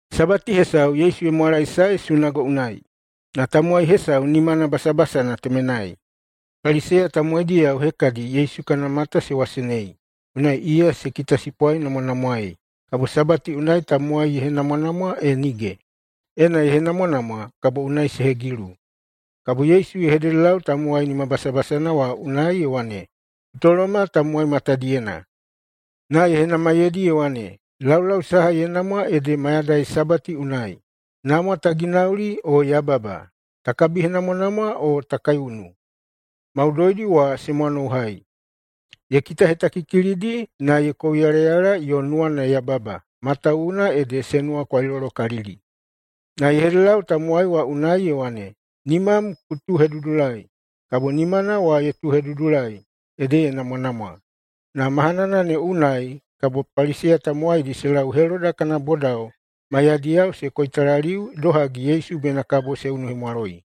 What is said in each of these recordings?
Sabati hesau Yesu ye mwalaesae sunago unai, na tamowai hesau nimana basabasana temenai. Paliseya tamowaidiyao hekadi Yesu kana mata se wasenei, unai iya se kitasipwainamwanamwaei, kabo Sabati unai tamowai ne ye henamwanamwa e nige. [Ena ye henamwanamwa, kabo unai se hegilu.] Kabo Yesu ye hededelau tamowai nimabasabasana wa unai ye wane, “Ku toloma tamowai matadiyena.” Na ye henamaiyeidi ye wane, “Laulau saha ye namwa ede mayadai Sabati unai: namwa ta ginauli o yababa, ta kabihenamwanamwa o ta kaiunu?” Maudoidi wa se mwanouhai. Ye kitahetakikilidi, na ye kouyalayala yo nuwana ye yababa, matawuwuna ede se nuwakwailolokalili. Na ye hededelau tamowai wa unai ye wane, “Nimam ku tuuhedudulai.” Kabo nimana wa ye tuuhedudulai, ede ye namwanamwa. Na mahanana ne unai kabo Paliseya tamowaidi se lau Heloda kana bodao maiyadiyao se koitalaliu idohagi Yesu bena kabo se unuhemwaloi.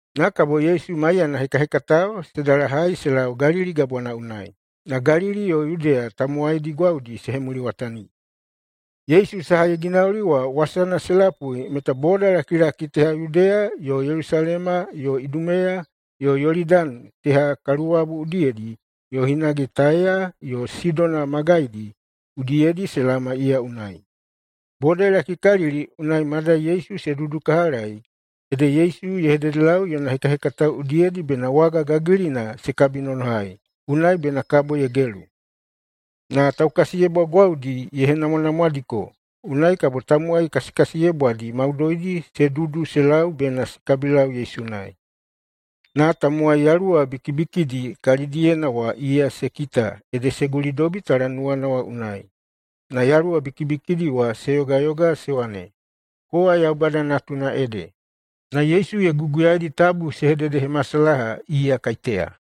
Na kabo Yesu maiyana hekahekatao se dalahai se lau Galili Gabwana unai, na Galili yo Yudeya tamowaidi gwaudi se hemuliwatani. Yesu saha ye ginauli wa wasana se lapui meta bodalakilaki teha Yudeya yo Yelusalema yo Idumeya yo Yolidani teha kaluwabu udiyedi yo hinage Taiya yo Sidona magaidi udiyedi se laoma iya unai. Boda ye lakikalili unai madai Yesu se dudukahalai, ede Yesu ye hededelau yona hekahekatao udiyedi bena waga gagilina se kabinonohai, unai bena kabo ye gelu. Na taukasiyebwa gwaudi ye henamwanamwadiko, unai kabo tamowai kasikasiyebwadi maudoidi se dudu se lau bena se kabilau Yesu unai. Na tamowai yaluwa bikibikidi kalidiyena wa iya se kita ede se gulidobi talanuwana unai, na yaluwa bikibikidi wa se yogayoga se wane, “Kowa Yaubada Natuna ede!” Na Yesu ye guguyaidi tabu se hededehemasalaha iya kaiteya.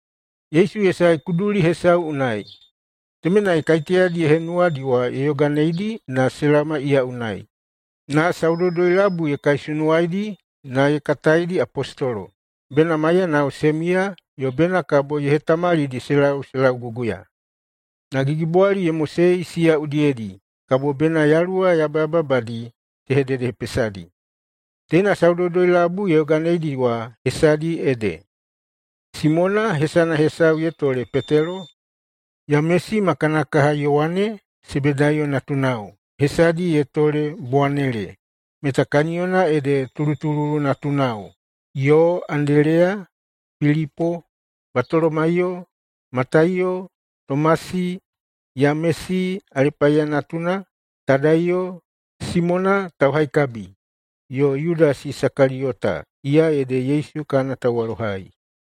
Yesu ye sae kuduli hesau unai. Temenai kaiteyadi ye henuwadi wa ye yoganeidi na se laoma iya unai. Na saudoudoi-labui ye kaisunuwaidi na ye kataidi apostolo. Bena maiyanao se miya, yo bena kabo ye hetamalidi se lau se lauguguya. Na gigibwali ye mosei siya udiyedi, kabo bena yaluwa yabayababadi se hededehepesadi. Teina saudoudoi-labui ye yoganeidi wa hesadi ede: Simona, hesana hesau ye tole Petelo, Yamesi ma kana kaha Yowane, Sebedaiyo natunao, hesadi ye tole Bowanele, meta kaniyona ede tulutululu natunao, yo Andeleya, Pilipo, Batolomaiyo, Mataiyo, Tomasi, Yamesi Alepaiya natuna, Tadaiyo, Simona Tauhaikabi, yo Yudasi Isakaliyota, iya ede Yesu kana tauwalohai.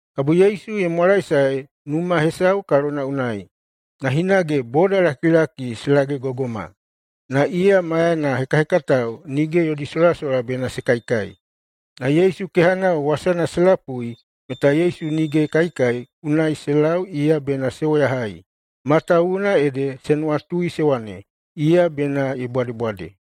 Kabo Yesu ye mwalaesae numa hesau kalona unai, na hinage bodalakilaki se lagegogoma. Na iya maiyana hekahekatao nige yodi solasola bena se kaikai. Na Yesu kehanao wasana se lapui meta Yesu nige ye kaikai, unai se lau iya bena se woyahai, matawuwuna ede se nuwatui se wane, “Iya bena ye bwadebwade!”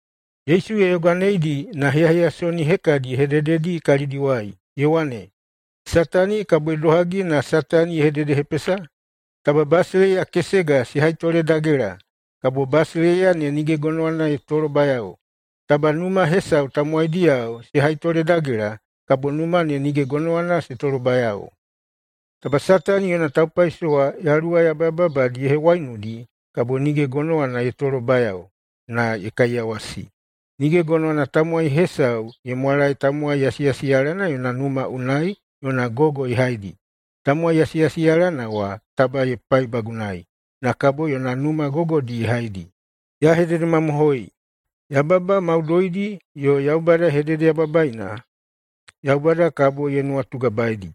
Yesu ye yoganeidi na heyaheyasoni hekadi ye hedededi kalidiwai, ye wane, “Satani kabo idohagi na Satani ye hededehepesa? Taba basileiya kesega se haitoledagela, kabo basileiya ne nige gonowana ye tolobayao. Taba numa hesau tamowaidiyao se haitoledagela, kabo numa ne nige gonowana se tolobayao. Taba Satani yona taupaisowa yaluwa yabayababadi ye hewaiunudi, kabo nige gonowana ye tolobayao, na ye kaiyawasi. Nige gonowana tamowai hesau ye mwalae tamowai yasiyasiyalana yona numa unai yona gogo ye haidi. Tamowai yasiyasiyalana wa taba ye paibagunai, na kabo yona numa gogodi ye haidi. Ya hededemamohoi: Yababa maudoidi yo Yaubada hededeyababaina Yaubada kabo ye nuwatugabaeidi.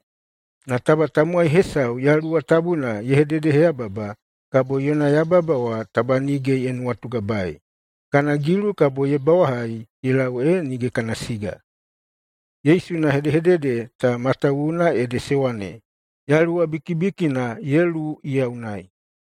Na taba tamowai hesau Yaluwa Tabuna ye hededeheyababa, kabo yona yababa wa taba nige ye nuwatugabaei. Kana gilu kabo ye bawahai ye lau ee nige kana siga.” Yesu yona hedehedede ta matawuwuna ede se wane, “Yaluwa bikibikina ye luwu iya unai.”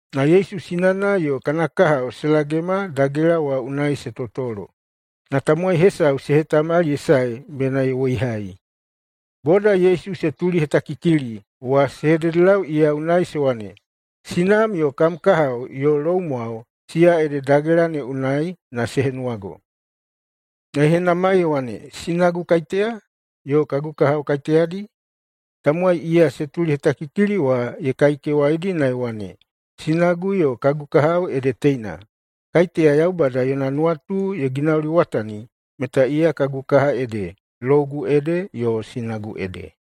Na Yesu sinana yo kana kahao se lagema dagela wa unai se totolo, na tamowai hesau se hetamali ye sae bena ye woihai. Boda Yesu se tulihetakikili wa se hededelau iya unai se wane, “Sinam yo kam kahao yo loumwao, siya ede dagela ne unai na se henuwago.” Na ye henamai ye wane, “Sinagu kaiteya? Yo kagu kahao kaiteyadi?” Tamowai iya se tulihetakikili wa ye kaikewaidi na ye wane, “Sinagu yo kagu kahao ede teina! Kaiteya Yaubada yona nuwatu ye ginauliwatani meta iya kagu kaha ede, lougu ede, yo sinagu ede.”